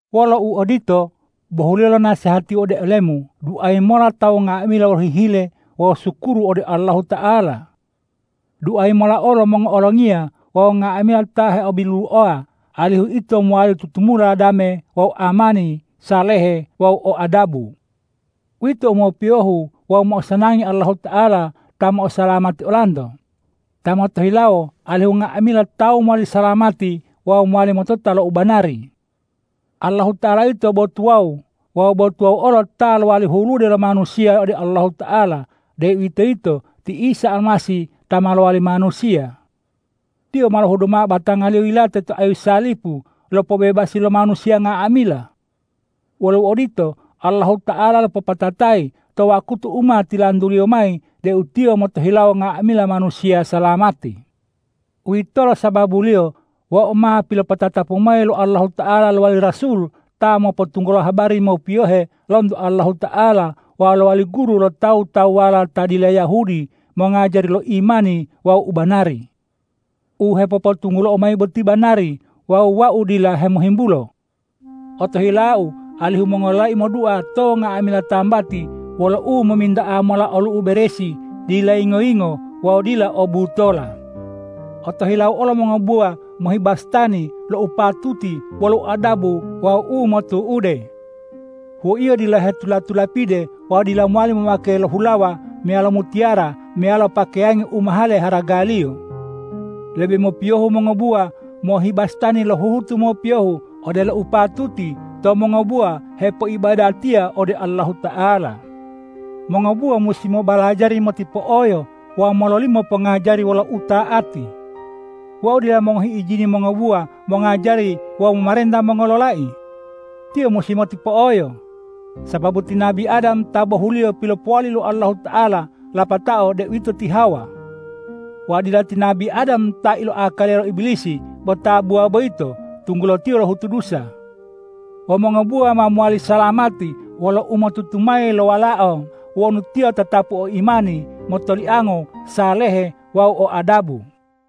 Wolo uodito, bohuliyo lo nasehatiu ode olemu, duayi mola tawu nga'amila wolo hihile wawu sukurumu ode Allahuta'ala. Duayi mola olo mongo'olongiya wawu nga'amila ta heobiluloawa alihu ito mowali tutumula dame wawu amani, salehe wawu o adabu. Uwito u mopiyohu wawu mo'osanangi Allahuta'ala ta mo'osalamati olanto, ta motohilawo alihu nga'amila tawu mowali salamati wawu mowali motota lo u banari. Allahuta'ala yito bo tuwawu wawu bo tuwawu olo Ta lowali hulude lo manusiya ode Allahuta'ala, deuwitoyito ti Isa Almasih ta ma lowali manusiya. Tiyo ma lohudu mao batanga-Liyo yilate to ayu salipu lopobebasi lo manusiya nga'amila. Wolo uodito, Allahuta'ala lopopatatayi to wakutu u ma tilantu-Liyo mayi deu Tiyo motohilawo nga'amila manusiya salamati. Uwitolo sababuliyo wau ma pilopotatapu mayi lo Allahuta'ala lowali rasul ta mopotunggulo habari mopiyohe lonto Allahuta'ala wawu lowali guru lo tawu-tawuwala ta dila Yahudi mongajari lo imani wawu u banari. U hepopotunggulou mayi boti banari wawu wau dila hemohimbulo. Otohilau alihu mongololai modua to nga'amila tambati wolo umominta'a mola olu'u beresi dila yingo-yingo wawu dila o butola. Otohilau olo mongobuwa mohibastani lo u patuti wolo adabu wawu u motu'ude. Huwoiyo dila hetula-tulapide wawu dila mowali momake lo hulawa meyalo mutiyara meyalo pakeyangi u mahale haragaliyo. Lebe mopiyohu mongobuwa mohibasitani lo huhutu mopiyohu, odelo u patuti to mongobuwa hepoibadatiya ode Allahuta'ala. Mongobuwa musi mobalajari motipo'oyo wawu mololimo pongajari wolo uta'ati. Wau dila mongohi ijini mongobuwa mongajari wawu momarenta mongololai. Tiyo musi motipo'oyo. Sababu ti nabi Adam ta bohuliyo pilopowali lo Allahuta'ala, lapatao deuwito ti Hawa. Wawu dila ti nabi Adam ta iloakaliya lo Ibilisi bo tabuwa boyito, tunggulo tiyo lohutu dusa. Bo mongobuwa ma mowali salamati wolo umotutu mayi lo walao wonu tiyo tatapu o imani, motoliango, salehe wawu o adabu.